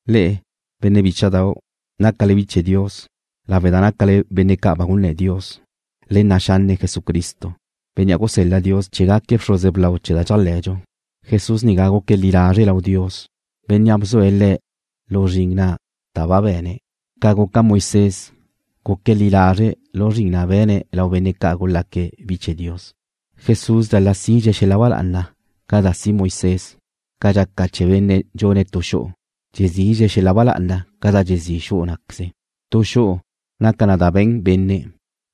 Le'e, benne' bícha'dau', nácale bi chee̱ Dios, lawe' da nácale benne' ca' ba gunné̱ Dios, le nna' xanne' Jesucristo, Bénnea' gusel-la Dios chee̱ gaque̱' bxruze blau chee̱ da dxéajle̱dxu. Jesús nigá guque̱' li lazre' lau Dios, Bénnea' bzue̱' Le̱' lu zrin na' da ba be̱ne̱', ca guca Moisés, guque̱' li lazre' lu zrin na' be̱ne̱' lau benne' ca' gulaque̱' bi chee̱ Dios. Jesús dxal-la' sidxe̱' xel-la' ba lá'ana ca da si' Moisés, ca dxaca chee̱ benne' dxune̱' tu xu'u, dxezidxe̱' xel-la' ba lá'ana ca da dxezí' xu'u ná'queze. Tu tu xu'u naca na da be̱n benne',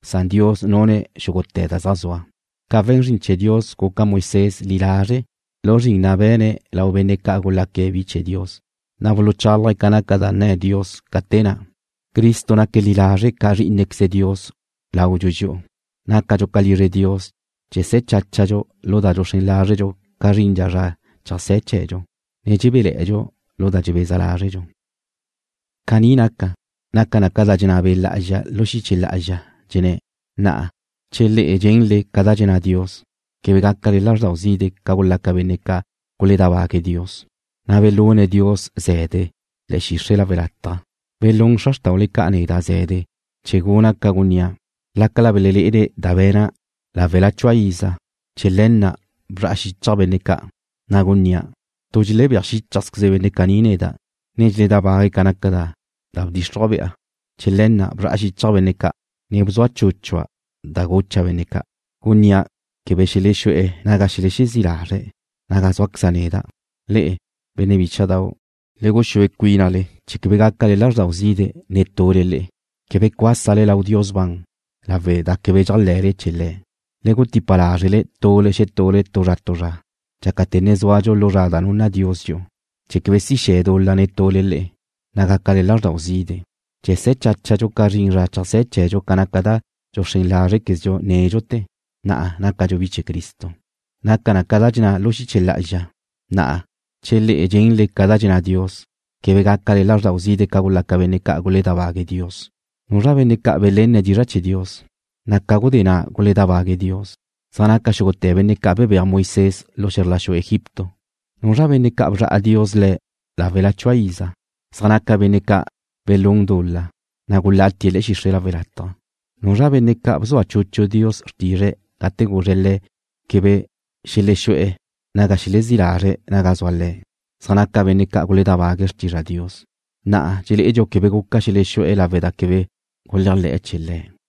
san Dios nune̱' xúgute̱ da zaj zua. Ca we̱n zrin chee̱ Dios guca Moisés li lazre' lu zrin na' be̱ne̱' lau benne' ca' gulaque̱' bi chee̱ Dios, na' bchálaje̱' ca naca da nne̱ Dios ca te na'. Cristo naque̱' li lazre' ca Zrí'inequeze Dios laudxu dxi'u. Nácadxu ca lizre Dios che se̱ cháchadxu lu da dxuxrén lázredxu ca zrindxa zra cheajsé̱ chee̱dxu, ne dxebéle̱'e̱dxu lu da dxebeza lázredxu. Caní naca, naca na ca da dxenná Be' Lá'azxa lu xiche lá'azxa, dxenné̱': Na'a, che le'e dxenle ca da dxenná Dios, quebe gácale lázrdau zide' ca gulaca benne' ca' guledábague̱' Dios, na' belune̱' Dios ze̱de le̱'e̱ xixre' lawe' lataj. Belún xra xrtaule ca' neda' ze̱de chee̱ guna' ca gunnía', lácala belelé'ene̱' da be̱na' láwela chua iza. Chee̱ le̱ na' bzra'a xichja' benne' ca', na' gunnía': Tu dxelebéaj xíchajzqueze benne' caní neda', ne dxeledábague̱' ca naca da bdxíxruja'. Chee̱ le̱ na' bzra'a xichja' benne' ca', ne bzua chúchua' da gucha' benne' ca', gunnía' quebe xelexú'e̱ naga xelexezí' lazre̱' naga zúaqueza' neda'. Le'e, benne' bícha'dau', le guxúe cuínale chee̱ quebe gaca lázrdau zide' netule le'e, quebe cuásale lau Dios ban lawe' da quebe dxéajle̱le chee̱ Le̱'. Le gutipa lázrele tule xetule tu zra tu zra, dxácate̱ ne zúadxu lu zra da nunna Dios dxi'u, chee̱ quebe si xe̱ dul-la netule le'e, na' gácale lázrdau zide'. Che se̱ cháchadxu ca zrin zra cheajsé̱ chee̱dxu ca naca da dxuxrén lázrequezdxu nédxute̱, na'a nácadxu bi chee̱ Cristo. Naca na ca dxenná na lu xiche lá'azxa: Na'a, che le'e dxenle ca da dxenná Dios, quebe gácale lázrdau zide' ca gulaca benne' ca' guledábague̱' Dios. ¿Nuzra benne' ca' belenne̱' dizra' chee̱ Dios, na' ca gudé na' guledábague̱' Dios? Zaj naca xúgute̱ benne' ca' bebéaj Moisés lu xe̱zr la xu Egipto. ¿Nuzra benne' ca' bzra'a Dios le̱' láwela chua iza? Zaj naca benne' ca' belún dul-la, na' gulátie̱' le̱'e̱ xixre' lawe' lataj. ¿Nuzra benne' ca' bzua chuchu Dios xrtizre̱' gate guzre̱' le̱' quebe xelexú'e̱ naga xelexezí' lazre̱' naga zua Le̱'? Zaj naca benne' ca' guledábague̱' xrtizra Dios. Na'a dxelé'edxu quebe guca xelexú'e̱ lawe' da quebe guléajle̱'e̱ chee̱ Le̱'.